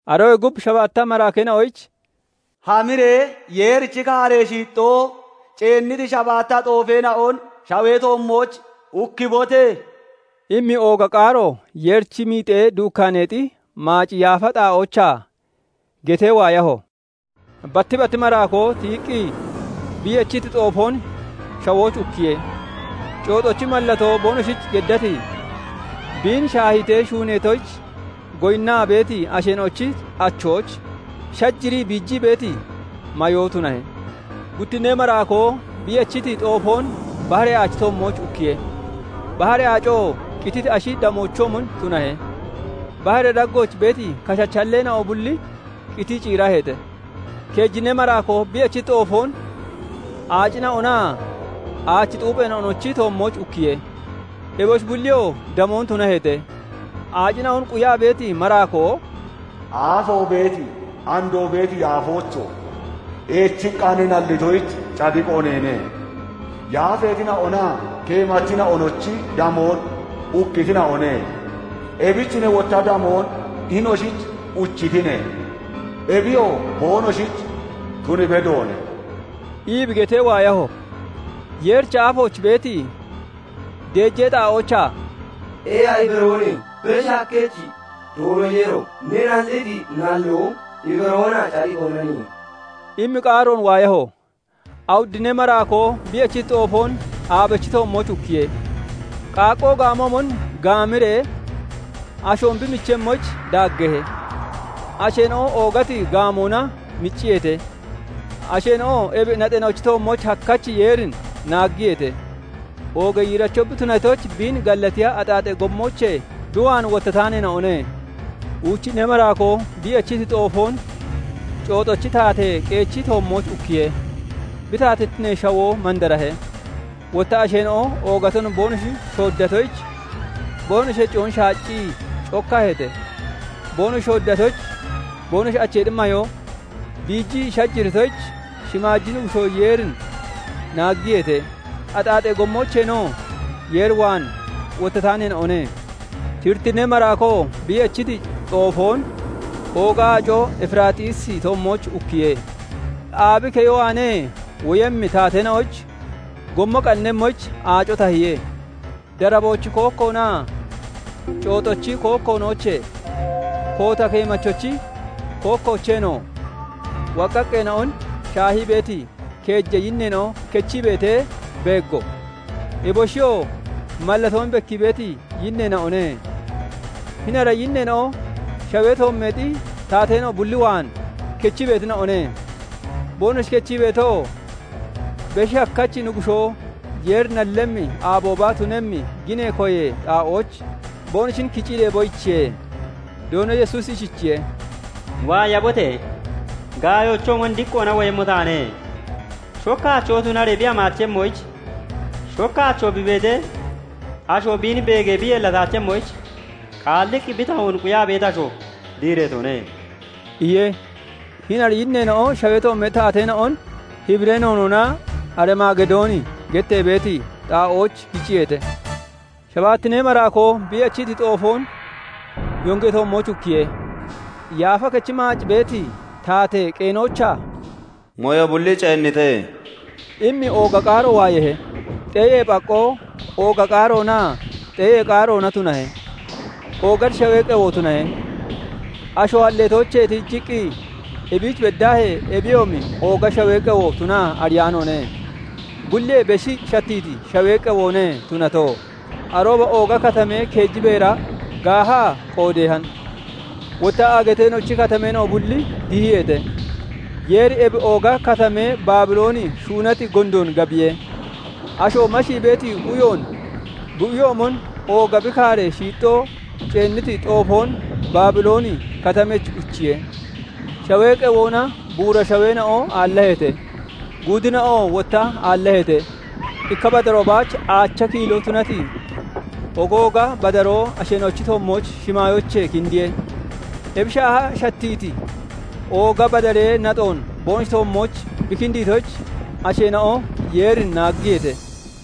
Aroyee gub shabaatta maraakeena'oyich "Hamiree Yeerichi kaaree shiixxoo ceenniti shabaatta xoofeena'on shawee toommooch ukkibote!" immi ooga qaaro Yeerichi miixee duukkaaneexi maaci yaafa xaa'oochaa getee waayaho. Batti batti maraakoo tiyiqqi bi yechiti xoofoon shawooch ukkiye; cooxochi mallatoo boonoshich geddati, biin shaahiitee shuuneetoyich goyinnaa beeti asheena'ochi achooch shajirii, biijii beeti mayoo tunahe. Guttinnee maraakoo bi yechiti xoofoon baharee aachi toommooch ukkiye; baharee aacoo qititi ashi damoochoomon tunahe; baharee daggooch beeti kashachi halleena'o bulli qitii ciiraheete. Keejinnee maraakoo bi yechiti xoofoon aacina'onaa aachi xuupheena'onochi toommooch ukkiye; eboshi bulliyoo damoon tunaheete. Aacina'on quyaa beeti maraakoo "Aafoo beeti, andoo beeti Yaafoocho! Eechiqqa ne nallitoyich cadiqo neene. Yaafeetina'onaa keemachina'onochi damoon ukkitina'one; ebich ne wotta damoon hinoshich uchitine; ebiyoo boonoshich tun bedoone!" ii bi getee waayaho. Yeerichi aafooch beeti deejee xaa'oochaa "Eeha; ibaroone; Beshi Hakkachi Doono Yeero! Ne nalliti nalloo ibaroonaa cadiqoonaniye" immi qaaroon waayaho. Awuddinnee maraakoo bi yechiti xoofoon aabechi toommooch ukkiye; qaaqqoo gaamoomon gaamiree ashoon bi michemmoyich daaggeehe. Asheena'o oogati gaamoona micciyeete; asheena'oo ebi naxeena'ochi toommooch hakkachi Yeerin naaggiyeete; oogee yiiracho bi tunatoyich biin gallatiya axaaxee gommoochee bi waan wottataanoone. Uuchinnee maraakoo bi yechiti xoofoon cooxochi taatee qeechi toommooch ukkiye; bi taatittinee shawoo mandarahe; wotta asheena'o oogaton boonoshi shooddatoyich boonoshi heciyoon shaaccii cokkaheete; boonoshi shooddatoyich, boonoshi acheexi mayoo biijii shajiritoyich shimaaji Nuggushoo Yeerin naaggiyeete; axaaxee gommoocheenoo Yeer waan wottataaneena'one. Shirittinnee maraakoo bi yechiti xoofoon ooga aaco Efiraaxiisi toommooch ukkiye; aabi keyo waanee woyemmi taateena'oyich gommo qannemmoyich aaco tahiye. Daraboochi kookkoonaa cooxochi kookkoonoochee, koota keemachochi kookkoocheenoo woqqaqqeena'on shaahii beeti keeja yinneena'o kechii beetee beeggo; eboshiyoo mallatoon bekkii beeti yinneena'one; hini ara yinneena'o shawee toommeexi taateena'o bulli waan kechii beetina'one; boonoshi kechii beetoo, Beshi Hakkachi Nuggushoo Yeeri nallemmi aabooba tunemmi ginee koyee xaa'ooch boonoshin kicii deeboyichiye. Doono Yesuusi ishichiye:- "Waayabote! Gaayoochoomon diqqoona woyemmo taane; shokka achoo tunaree bi hamaachemmoyich, shokka achoo bi beetee asho biin beegee bi yeellataachemmoyich, qaalliqqi bi tahoon quyaa beeti asho diireetone" iye. Hini ara yinneena'o shawee toommeexi taateena'on Hibiree noonoona Arimaagidooni gettee beeti xaa'ooch kiciyeete. Shabaattinnee maraakoo bi yechiti xoofoon yongee toommooch ukkiye; yaafa kechi maac beeti taatee qeenoochaa "Mooyo bulli ceennite!" immi ooga qaaro waayeehe. Xeeyee phaqqoo, ooga qaaroonaa xeeyee qaaroona tunahe; oogati shawee qewo tunahe; asho halleetoochee tiijiqqi ebiich beddaahee ebiyoomi ooga shawee qewo tunaa ariyaanoone; bulliyee beshi shattiiti shawee qewoone tunato. Arooba ooga katamee keeji beera gaahaa qoodeehan; wotta aagateena'ochi katameena'o bulli dihiyeete; Yeeri ebi ooga katamee Baabilooni shuunati gondoon gabiye; asho mashii beeti uyoon bi uyoomon ooga bi kaaree shiixxoo ceenniti xoofoon Baabilooni Katamech uchiye. Shawee qewoona buura shaweena'o aallaheete; guudina'oo wotta aallaheete. Ikka badaroo baach aacha kiiloo tunati ogooga badaroo asheena'ochi toommooch shimaayoochee kindiye; ebi shaaha shattiiti ooga badaree naxoon boonoshi toommooch bi kindiitoyich, asheena'o Yeerin naaggiyeete.